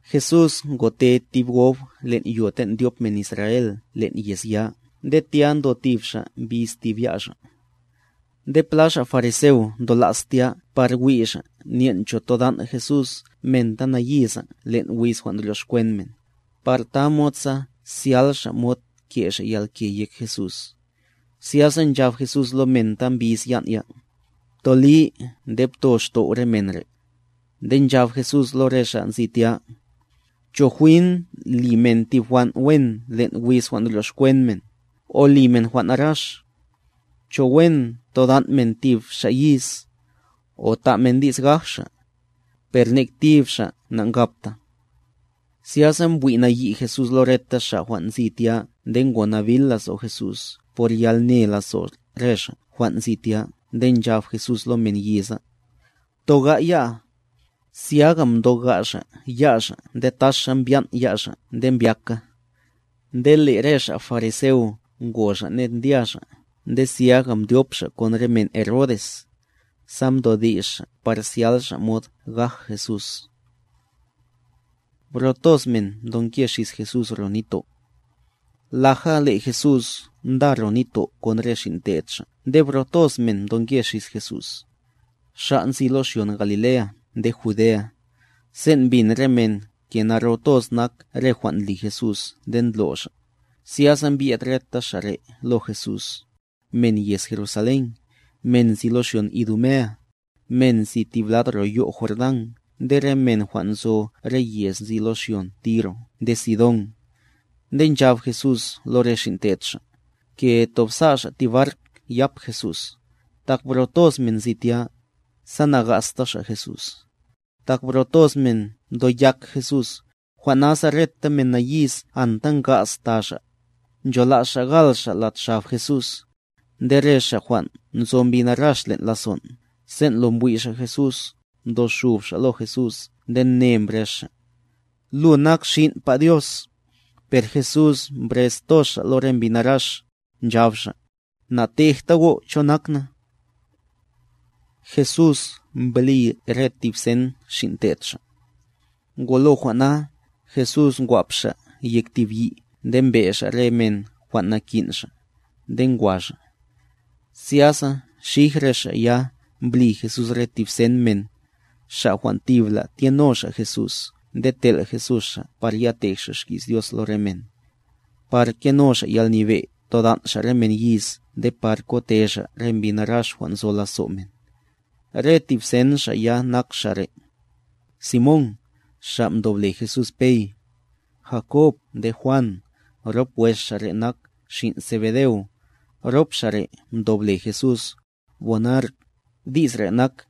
Jesús ngote tib gob len' yo ten' ndyop men Israel len' yez ya, nde tya ndo tib xa' mbiz tib ya' xa'. Nde pla xa' fariseo ndo la's tya par wi' xa' nyen' cho todan' Jesús men ta nayiza len' wiz jwan' ndryoxkwen men, sa tamod zyal xa' yalke ke' xa' yek Jesús. Zyasa nchab Jesús lo men ta mbiz yan' ya: —Ptoli nde pto xtow' re men re'. Nde nchab Jesús lo re xa' nzi tya: —¿Cho jwin li men tib jwan' wen len' wiz jwan' ndryoxkwen men, o li men jwan' narax? ¿Cho wen todan' men tib xa' yiz, o ta' men di's gaj xa'? Per nek tib xa' nankabta. Zyasa mbwi' nayi' Jesús lo reta xa' jwan' nzi tya nde ngo nabil lazo' Jesús por yalne lazo' re xa' jwan' nzi tya nde nchab Jesús lo men yiza: —Btoga' ya'a. Zyaga mtoga' xa' ya' xa' nde taxa mbyan' ya' xa' nde mbyaka. Nde le' re xa' fariseo ngo xa' ned ndya xa' nde zyaga mdyop xa' kon re men Herodes, sa mdodi's xa' par zyal xa' mod gaj Jesús. Bro toz men mdoke xis Jesús ro nitto' Laja le' Jesús nda ro nitto' kon re xin' te'd Xa' nde bro toz men mdoke xis Jesús, xa' nzi lo xyon Galilea nde Judea. Sen' mbin re men ke naro toz nak re jwan' ndli Jesús nde ndlo' Xa', zyasa mbye'd reta xa' re' lo Jesús, men yez Jerusalén, men nzi lo xyon Idumea, men nzi tib lad ro yo' Jordán nde re men jwan' nzo re yez nzi lo xyon Tiro nde Sidón. Nde nchab Jesús lo re xin' te'd Xa', ke tob sa' xa' tib bark yap Jesús, tak bro toz men nzi tya, sa nagasta xa' Jesús. Tak bro toz men mtoyak Jesús, jwan' nasa reta men nayiz anta nga'z ta xa', nchola's xa' gal xa' lad xab Jesús. Nde re xa' jwan' nzo mbi narax len' lazon', sen' lo mbwi' xa' Jesús, mdoxub xa' lo Jesús nde ne mbrez xa': —Lu nak Xin'pa Dios. Per Jesús mdokox toz Xa' re mbi narax, nchab Xa': —Natejta go' cho nak na. Jesús mbli re tib sen xin' te'd xa' Ngolo jwan' na, Jesús ngwap Xa' yek tib yi' nde mbrez xa' re men jwan' nchola's Xa'; nde ngwa xa' lo Jesús. Zyasa xij re xa' ya mbli Jesús tib sen men, xa' jwan' tibla tyeno xa' Jesús nde tel' Jesús xa' sa ya tej xa' xki's Dios lo re men. Sa keno xa' yalnyebe' todan' xa' re men yiz nde par kote xa' re mbi narax jwan' nzo lazo' men. Re tib sen xa' ya nak xa' re': Simón (xa' mdob le Jesús Pey), Jakob nde Juan (rop wes xa' re' nak xin' Zebedeo, rop xa' re' mdob le Jesús, Boanerg, di's re' nak: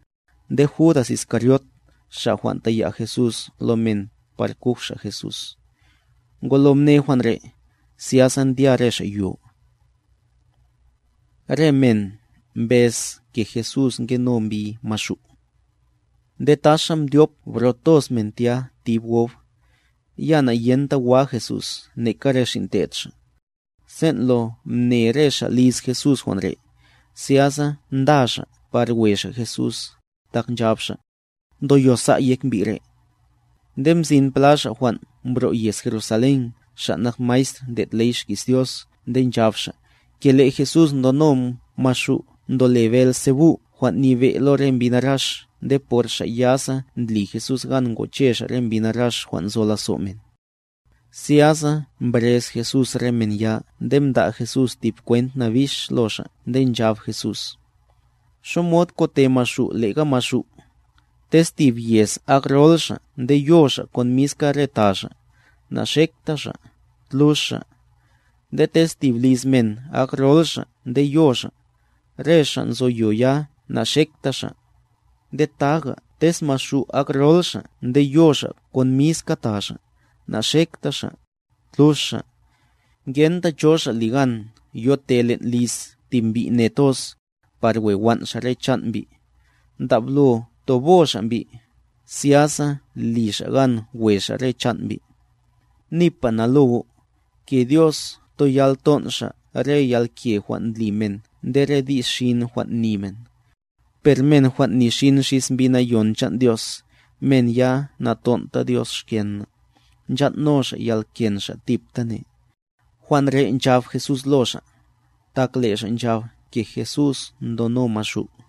nde Judas Iscariot (xa' jwan' taya' Jesús lo men par kuj xa' Jesús). Ngolo mne jwan' re', zyasa ndya re xa' yo. Re men mbez ke Jesús ngeno mbi Maxu' Nde taxa mdyop bro toz men tya tib gob, ya nayenta wa Jesús neka re xin' te'd Xa'. Sen' lo mne re xa' liz Jesús jwan' re', zyasa nda xa' par we xa' Jesús, tak nchab xa': —Ndoyosa' yek mbi' re'. Nde mzin pla xa' jwan' mbro' yez Jerusalén xa' nak maestr ndlo' ley xki's Dios nde nchab xa', ke le' Jesús ndono Maxu' ndole Beelzebu' jwan' nyebe' lo re mbi narax nde por xa' ya sa ndli Jesús gan ngoche Xa' re mbi narax jwan' nzo lazo' men. Zyasa mbrez Jesús re men ya nde mda' Jesús tib kwent nabix lo xa' nde nchab Jesús: —¿Xamod kote Maxu' lega Maxu'? Tez tib yez ak rol xa' nde yo xa' kon le'ga re ta xa', naxekta xa', tlux xa'. Nde tez tib liz men ak rol xa' nde yo xa', re xa' nzo yo ya naxekta xa'. Nde taga tez Maxu' ak rol xa' nde yo xa' kon miska ta xa', naxekta xa', tlux xa'. ’Ngenta cho xa' ligan yote len' liz tib mbi' ne toz, par we wan' xa' re chan' mbi', ndablo tobo xa' mbi', zyasa li xa' gan we xa' re chan' mbi'. ’Nipa na lo go', ke Dios toyal nton' Xa' re yalke jwan' ndli men nde re di's xin jwan' ni men. Per men jwan' ni xin xis Mbi Nayon chan' Dios, men ya naton'ta Dios xken na', nchan' no xa' yalken xa' tiptane. Jwan' re' nchab Jesús lo xa', tak le' xa' nchab ke Jesús ndono Maxu'.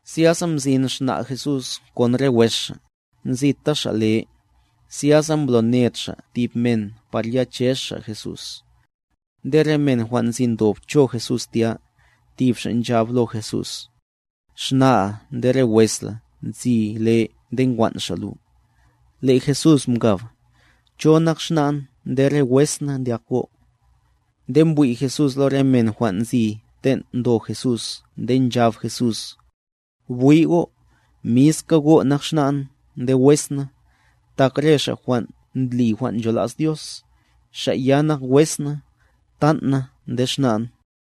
Zyasa mzin xna' Jesús kon re wes xa', nzita xa' le, zyasa mbloned xa' tib men par ya chez xa' Jesús. Nde re men jwan' nzi ndob cho Jesús tya, tib xa' nchab lo Jesús: —Xna'a nde re wes la nzi le nde nkwan' xa' lu. Le' Jesús mkab: —¿Cho nak xna'n nde re wes na, ndyak go'? Nde mbwi' Jesús lo re men jwan' nzi ten' ndo Jesús nde nchab Jesús: —Bwi' go', miska go' nak xna'n nde wes na. Tak re xa' jwan' ndli jwan' nchola's Dios, xa' ya nak wes na, btan' na nde xna'n.